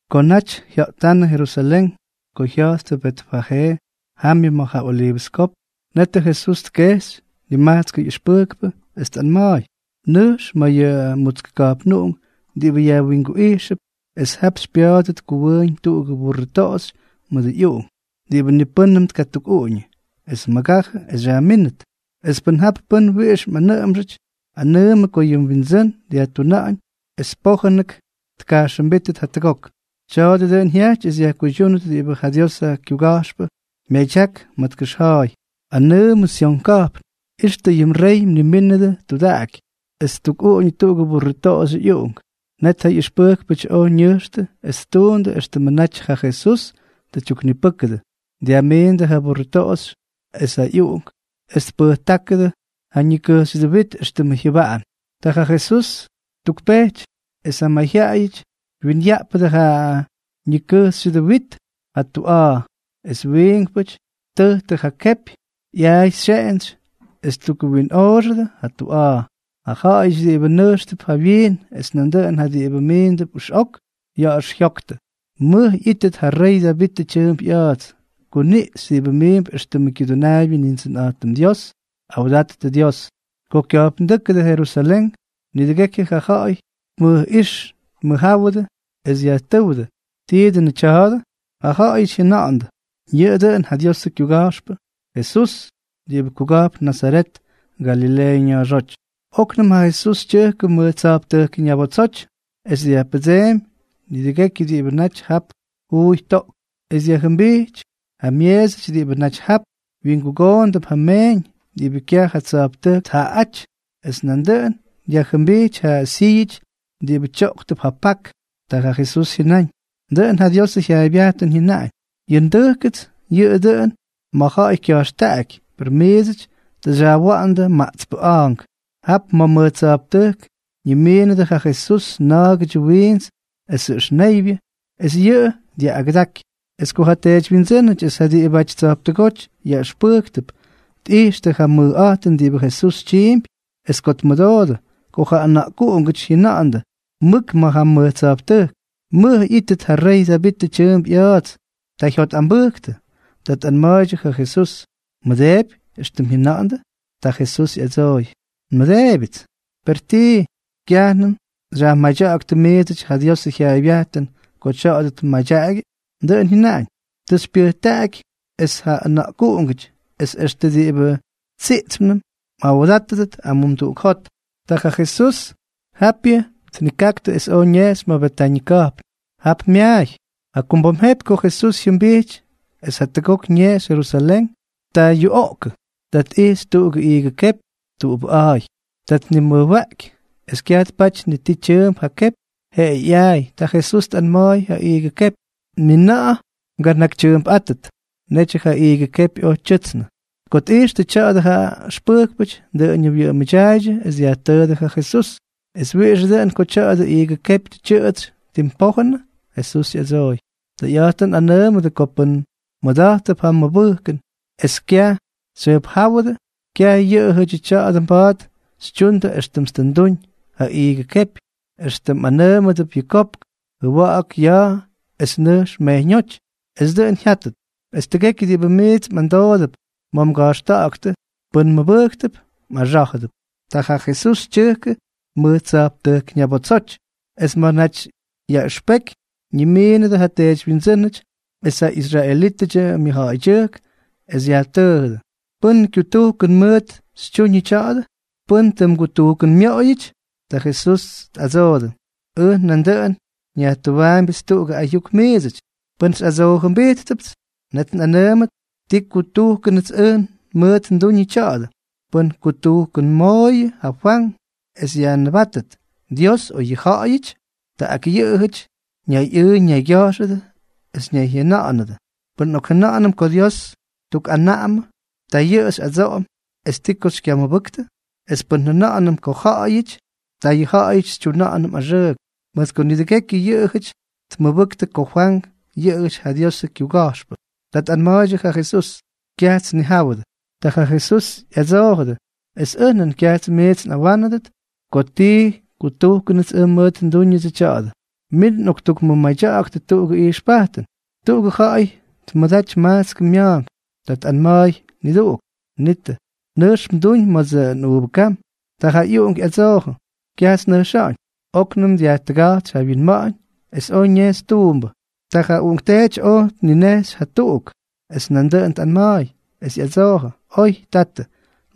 Ko naty jya̱ꞌtánnʉ Jerusalén, ko jya̱jttʉ Betfajee, jamyʉ ma̱ ja Oliivʉs Kopk, netʉ Jesús tkejxy nimajtskʉ ꞌyʉxpʉjkpʉ, es tꞌanma̱a̱y: —Nʉjx ma̱ yʉ mutsk ka̱jpnuꞌunk diꞌibʉ yajwinguꞌijxʉp, es jap xypya̱a̱dʉt kuwʉʉñ tuꞌugʉ burrʉ toꞌoxy mʉdʉ ꞌyuꞌunk diꞌibʉ ni pʉ́nnʉm tkatukꞌuꞌuñʉ, es mʉgajʉ es xyajmínʉt. Es pʉn jap pʉ́n wiꞌix mꞌanʉꞌʉmxʉty, anʉʉmʉ ko yʉ mwindsʉ́n dyajtuna̱ꞌa̱ñ es pójʉnʉk tkajxʉmbítʉt jatʉgok. Tya̱a̱dʉ dʉꞌʉn jyajty es yajkuydyúnʉt diꞌibʉ ja Diosʉ kyuga̱jxpʉ myadyak ma̱ tkʉxja̱a̱y: Anʉʉmʉ Syon ka̱jpn: “Ixtʉ yʉ mrey mnimínʉdʉ, tudaꞌaky, es ttukꞌuꞌuñʉ tuꞌugʉ burrʉ toꞌoxyʉ ꞌyuꞌunk.” Net ja ꞌyʉxpʉjkpʉty oj ñʉjxtʉ es ttuundʉ éxtʉmʉ naty ja Jesús tʉ tyuknipʉ́kʉdʉ, dyajmiindʉ ja burrʉ toꞌoxy es ja ꞌyuꞌunk, es tpʉjtáktʉ ja ñikʉjxyʉdʉ wit éxtʉmʉ jyʉbaꞌan. Ta ja Jesús ttukpejty. Es ja mayjyaꞌayʉty dwinyaꞌpʉdʉ ja ñikʉjxyʉdʉ wit ja tuꞌa̱a̱, es wiinkpʉty ttʉjtʉ ja kepyʉ ꞌyaay xyeꞌentsy es ttukwinꞌoꞌoxʉdʉ ja tuꞌa̱a̱. Ja ja̱ꞌa̱yʉty diꞌibʉ nʉjxtʉp jawyiin es nandʉꞌʉn ja diꞌibʉ miindʉp ʉxꞌok ya̱ꞌa̱x jyoktʉ: —¡Mʉj ꞌyítʉt ja rey Davitʉ tyʉʉmp ꞌya̱a̱ts! ¡Kuniꞌxy diꞌibʉ miimp éxtʉmʉ Kyudʉnaabyʉ Nindsʉnꞌa̱jtʉm Dios! ¡Awdattʉ Dios! Ko kya̱jpndʉjkʉdʉ Jerusalén, nidʉgekyʉ ja ja̱ꞌa̱y tmʉjꞌíx dmʉjjáwʉdʉ, es dyajtʉ́wdʉ: —¿Tii dʉnʉ tya̱a̱dʉ? Ja ja̱ꞌa̱yʉty jyʉna̱ꞌa̱ndʉ: —Yʉꞌʉ dʉꞌʉn ja Diosʉ kyuga̱jxpʉ, Jesús diꞌibʉ kuga̱jpn Nazaret, Galileeʉ ña̱a̱xóty. Oknʉm ja Jesús tyʉjkʉ mʉj tsa̱jptʉjk ñabotsoty es dyajpʉdseemy nidʉgekyʉ diꞌibʉ naty jap juuy toꞌktʉp, es dyajjʉmbijty ja myeesʉty diꞌibʉ naty jap wyingugoondʉp ja meeñ diꞌibʉ kyaj ja tsa̱jptʉjk tjaꞌaꞌáty, es nandʉꞌʉn dyajjʉmbijty ja syíyʉty diꞌibʉ tyoꞌktʉp ja pak. Ta ja Jesús jyʉnáñ: —Dʉꞌʉn ja Diosʉ jyaaybyajtʉn jyʉnaꞌañ: “Yʉ ndʉjkʉts yʉꞌʉ dʉꞌʉn ma̱ ja̱ꞌa̱y kya̱jxtaꞌaky”, per miidsʉty tʉ xyajwa̱ꞌa̱ndʉ maꞌtspʉ a̱a̱nk. Jap ma̱ mʉj tsa̱jptʉjk ñimiinʉdʉ ja Jesús na̱a̱gʉdyʉ wiints esʉ ʉxneybyʉ, es yʉꞌʉ dyaꞌꞌagʉdaky. Es ko ja teedywyindsʉ́nʉty es ja diꞌibʉty tsa̱jptʉgóty yaꞌʉxpʉjktʉp tꞌijxtʉ ja mʉjꞌa̱jtʉn diꞌibʉ Jesús tyiimpy, es ko tmʉdoodʉ ko ja ʉna̱ꞌkuꞌungʉty jyʉna̱ꞌa̱ndʉ mʉk ma̱ ja mʉj tsa̱jptʉjk: “¡Mʉj ꞌyítʉt ja rey Davitʉ tyʉʉmp ꞌya̱a̱ts!”, ta jyotꞌambʉjktʉ. Ta tꞌanma̱a̱ydyʉ ja Jesús: —¿Mmʉdeepy éxtʉm jyʉna̱ꞌa̱ndʉ? Ta Jesús ꞌyadsooy: —Nmʉdeebyʉts. ¿Per tii, kyajnʉm xyajmadya̱ꞌa̱ktʉ miidsʉty ja Diosʉ jyaaybyajtʉn ko tya̱a̱dʉ tmadyaꞌagyʉ? Dʉꞌʉn jyʉnaꞌañ: Tʉ xypyʉjtaꞌaky es ja ʉna̱ꞌkuꞌungʉty, es extʉ diꞌibʉ tsiꞌtspnʉm, mꞌawdátʉdʉt amumduꞌuk jot. Ta ja Jesús japyʉ tnikaktʉ, es oj ñejxy ma̱ Betañʉ ka̱jpn. Jap myaay. Jakumbom jepy ko Jesús jyʉmbijty es jatʉgok ñejxy Jerusalén, ta yuꞌoꞌkʉ. Ta tꞌijxy tuꞌugʉ iigʉ kepy tuꞌubʉꞌa̱a̱y. Ta tnimʉjwaꞌky, es kyaj tpaty ni ti tyʉʉmp ja kepy, jeꞌeyʉ ꞌyaay. Ta ja Jesús tꞌanma̱a̱y ja iigʉ kepy: —Ni na̱ꞌa̱ mganakytyʉʉmpꞌátʉt. Netyʉ ja iigʉ kepy oj tyʉtsnʉ. Ko tꞌijxtʉ tya̱a̱dʉ ja ʉxpʉjkpʉty, dʉꞌʉñʉ wyʉꞌʉmʉdyaaydyʉ es dyajtʉʉdʉ ja Jesús: —¿Es wiꞌixʉ dʉꞌʉn ko tya̱dʉ iigʉ kepy tʉ tyʉꞌʉtsy tim pójʉnʉ? Jesús ꞌyadsooy: —Tʉyꞌa̱jtʉn nꞌanʉʉmʉdʉ ko pʉn mmʉda̱jttʉp ja mʉbʉjkʉn es kyaj xyjʉjpjáwʉdʉ, kyaj yʉꞌʉyʉdyʉ tya̱a̱dʉ mba̱a̱t xytyundʉ éxtʉmts tʉ nduñ ja iigʉ kepy, extʉ mꞌanʉʉmʉdʉbʉ tya̱dʉ kopk: “Jʉwa̱ꞌa̱k ja ya̱a̱ es nʉjx mejyñóty.” Es dʉꞌʉn jyátʉt. Es tʉgekyʉ diꞌibʉ miits mꞌamdoodʉp ma̱ mga̱jxta̱ꞌa̱ktʉ, pʉn mmʉbʉjktʉp, mꞌaxá̱jʉdʉp. Ta ja Jesús tyʉjkʉ mʉj tsa̱jptʉjk ñabotsoty. Es ma̱ naty yaꞌʉxpeky ñimiinʉdʉ ja teedywyindsʉ́nʉty es ja israelítʉdyʉ myʉjja̱ꞌa̱ydyʉjk, es yajtʉʉjʉdʉ: —¿Pʉ́n kyutujkʉn mʉʉt xytyuñʉ tya̱a̱dʉ? ¿Pʉ́n tʉ mgutujkʉnmoꞌoyʉty? Ta Jesús tꞌadsoodʉ: —Ʉj nandʉꞌʉn nyajtʉwaambyʉts tuꞌugʉ ayuk miidsʉty. Pʉn xyꞌadsoojʉmbijtpʉts, net nꞌanʉʉmʉt ti kutujkʉnʉts ʉj mʉʉt nduñʉ tya̱a̱dʉ. ¿Pʉ́n kutujkʉnmooyʉ ja Fwank es yajnʉbátʉt, Dios o yʉ ja̱ꞌa̱yʉty? Ta ak yʉꞌʉjʉty ñayꞌʉʉ ñaygya̱jxʉdʉ es ñayjyʉna̱ꞌa̱nʉdʉ: —Pʉn nꞌokjʉna̱ꞌa̱nʉm ko Dios tukꞌanaꞌamʉ, ta yʉ xyꞌadsoꞌom: “¿Es ti ko xykyamʉbʉktʉ?” Es pʉn njʉna̱ꞌa̱nʉm ko ja̱ꞌa̱yʉty, ta yʉ ja̱ꞌa̱yʉty xytyuꞌunʉm axʉʉk, mʉt ko nidʉgekyʉ yʉꞌʉjʉty tmʉbʉktʉ ko Fwank yʉꞌʉjʉty ja Diosʉ kyuga̱jxpʉ. Ta tꞌanma̱a̱ydyʉ ja Jesús: —Kyajts nnijáwʉdʉ. Ta ja Jesús ꞌyadsoojʉdʉ: —Es ʉj nan kyajts miits nꞌawánʉdʉt ko ti kutujkʉnʉts ʉj mʉʉt ndúñʉdsʉ tya̱a̱dʉ. Min nꞌoktukmʉmadya̱ꞌa̱ktʉ tuꞌugʉ ijxpajtʉn: —Tuꞌugʉ ja̱ꞌa̱y tmʉdaty majtskʉ mya̱a̱nk. Ta tꞌanma̱a̱y niduꞌuk: “Nitʉ, nʉjx mduñ ma̱dsʉ nꞌuuvʉ kam.” Ta ja ꞌyuꞌunk ꞌyadsoojʉ: “Kyajts nnʉjxa̱ꞌa̱ñ.” Oknʉm dyajtʉga̱jtsy ja wyinma̱ꞌa̱ñ, es oj ñejxy tuumbʉ. Ta ja uꞌunkteety oj tninejxy jatuꞌuk, es nandʉꞌʉn tꞌanma̱a̱y. Es ꞌyadsoojʉ: “Oy, tatʉ,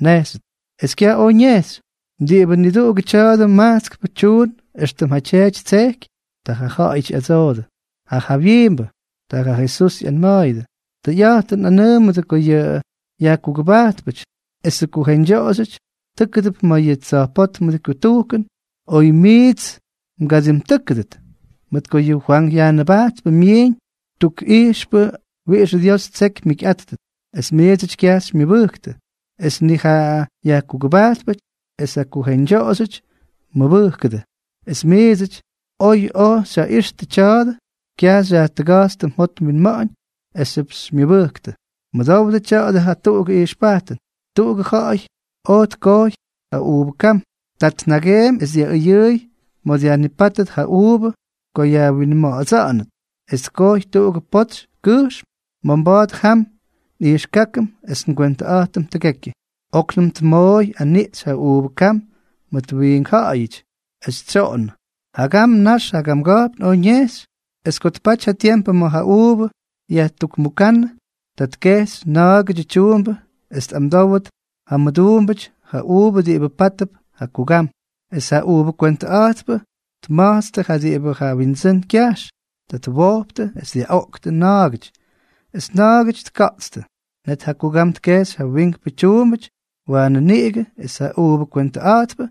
nnejxyʉts.” Es kyaj oj ñejxy. ¿Diꞌibʉ niduꞌugʉ tya̱dʉ majtskpʉ tyuun éxtʉm ja tyeety ttsejky? Ta jaꞌajʉty ꞌyadsoodʉ: —Ja jawyiimbʉ. Ta ja Jesús ꞌyanma̱a̱yʉdʉ: —Tʉyꞌa̱jtʉn nꞌanʉʉmʉdʉ ko yʉ yajkugʉbajtpʉty esʉ kujeñdyoꞌoxyʉty tʉ́kʉdʉp ma̱ yʉ tsa̱jpótmʉdʉ kutujkʉn oy miits mgadimtʉ́kʉdʉt. Mʉt ko yʉ Fwank Yajnʉbajtpʉ myiiñ tukꞌijxpʉ wiꞌixʉ Dios ttseky mjikyꞌáttʉt, es miidsʉty kyaj xymyʉbʉjktʉ, es nik ja yajkugʉbajtpʉty es ja kujeñdyoꞌoxyʉty mʉbʉjkʉdʉ. Es miidsʉty, oy oj xyjaꞌixtʉ tya̱a̱dʉ, kyaj xyajtʉga̱jtstʉ mjot mwinma̱ꞌa̱ñ esxyʉp xymyʉbʉjktʉ. ’Mʉdowdʉ tya̱dʉ jatuꞌugʉ ijxpajtʉn. Tuꞌugʉ ja̱ꞌa̱y oj tkojy ja uuvʉ kam. Ta tnageemy es dyaꞌʉyʉʉy ma̱ dyajnipátʉt ja uuvʉ ko yajwinma̱ꞌa̱dsa̱ꞌa̱nʉt, es tkojy tuꞌugʉ potsy kʉjxm ma̱ mba̱a̱t jam nꞌijxkákʉm es ngwentʉꞌa̱jtʉm tʉgekyʉ. ’Oknʉm tmooy aniꞌxy ja uuvʉ kam mʉt wiink ja̱ꞌa̱yʉty, es tsyoꞌonnʉ. Jagam nax jagamga̱jpn oj ñejxy. Ko tpaty ja tiempʉ ma̱ ja uuvʉ yajtujkmukánnʉ, ta tkejxy na̱a̱gʉdyʉ tyuumbʉ es tꞌamdówʉt ja mʉduumbʉty ja uuvʉ diꞌibʉ pátʉp ja kugam. Es ja uuvʉ kamgwentʉꞌa̱jtpʉ tma̱jtstʉ ja diꞌibʉ ja windsʉ́n kyajx. Ta twojptʉ es dyaꞌoꞌktʉ na̱a̱gʉty, es na̱a̱gʉty tka̱ꞌtstʉ. Net ja kugam tkejxy ja wiinkpʉ tyuumbʉty waanʉ niꞌigʉ, es ja uuvʉ kamgwentʉꞌa̱jtpʉ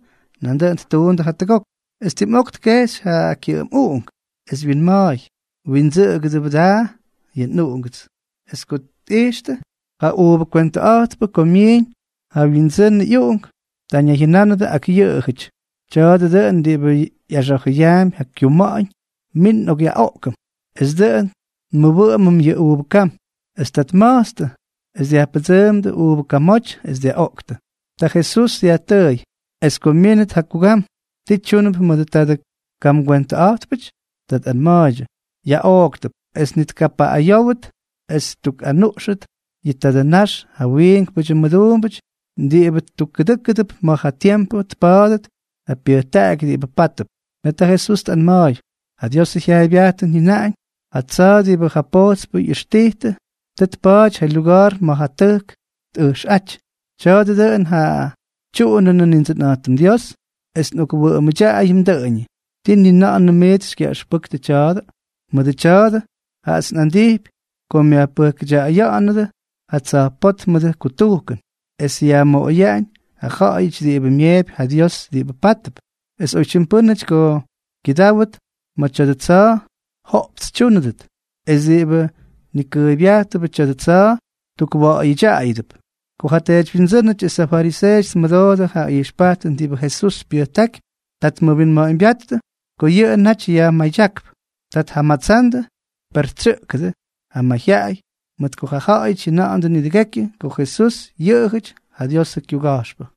nandʉꞌʉn ttuundʉ jatʉgok. ’Es tim ok tkejxy ja kyʉꞌʉm uꞌunk, es wyinma̱a̱y: “Wyindsʉꞌʉgʉbʉ daa yʉ nꞌuꞌunk.” Es ko tꞌijxtʉ ja uuvʉ kamgwentʉꞌa̱jtpʉ ko myiñ ja wyindsʉnʉ ꞌyuꞌunk, ta ñayjyʉnánʉdʉ ak yʉꞌʉjʉty: “Tya̱a̱dʉ dʉꞌʉn diꞌibʉ ꞌyaxa̱jʉyaampy ja kyuma̱ꞌa̱ñ. Min nꞌokꞌyaꞌoꞌkʉm es dʉꞌʉn nmʉwʉꞌʉmʉm yʉ uuvʉ kam.” Es ta tma̱jtstʉ, es dyajpʉdsʉʉmdʉ uuvʉ kamoty es dyaꞌoꞌktʉ. Ta Jesús dyajtʉʉy: —Es ko myínʉt ja kugam, ¿ti tyúnʉp mʉdʉ tadʉ kamgwentʉꞌa̱jtpʉty? Ta tꞌanma̱a̱ydyʉ: —Yaꞌooktʉp es ni tkapaꞌꞌayówʉt, es ttukꞌanuꞌxʉt yʉ tadʉ ñax ja wiinkpʉty mʉduumbʉty diꞌibʉ tukkʉdʉ́kʉdʉp ma̱ ja tiempʉ tpa̱a̱dʉt ja pyʉjtaꞌaky diꞌibʉ pátʉp. Net ja Jesús tꞌanma̱a̱y: —Ja Diosʉ jyaaybyajtʉn jyʉnaꞌañ: Ja tsa̱a̱ diꞌibʉ ja pojtspʉ ꞌyʉxtijtʉ, tʉ tpa̱a̱ty ja lyuga̱a̱r ma̱ ja tʉjk tꞌʉjxꞌáty. Tya̱a̱dʉ dʉꞌʉn ja tyuꞌunʉnʉ Nindsʉnꞌa̱jtʉm Dios, es nꞌokwʉꞌʉmʉdyaꞌayʉm dʉꞌʉñʉ. ¿Tii ni na̱ꞌa̱nʉm miits xykyaꞌʉxpʉktʉ yʉ tya̱a̱dʉ? Mʉdʉ tya̱a̱dʉ, jaꞌats nꞌandijpy ko myajpʉjkʉya̱ꞌa̱nʉdʉ ja tsa̱jpótmʉdʉ kutujkʉn, es yajmoꞌoyaꞌañ ja ja̱ꞌa̱yʉty diꞌibʉ myeepy ja Dios diꞌibʉ pátʉp. Es oytyim pʉ́nʉty ko kyʉdáwʉt ma̱ tya̱dʉ tsa̱a̱, joꞌpts tyúnʉdʉt; es diꞌibʉ nikʉʉybyajtʉbʉ tya̱dʉ tsa̱a̱, tukwa̱ꞌa̱yʉdyaꞌayʉdʉp. Ko ja teedywyindsʉ́nʉty es ja fariseeʉty tmʉdoodʉ ja ijxpajtʉn diꞌibʉ Jesús pyʉjtákypy, ta tmʉwinma̱ꞌa̱ñbyáttʉ ko yʉꞌʉ naty yajmadyákp. Ta tjamatsandʉ, per tsyʉꞌkʉdʉ ja mayjyaꞌay, mʉt ko ja ja̱ꞌa̱yʉty jyʉna̱ꞌa̱ndʉ nidʉgekyʉ ko Jesús yʉꞌʉjʉty ja Diosʉ kyuga̱jxpʉ.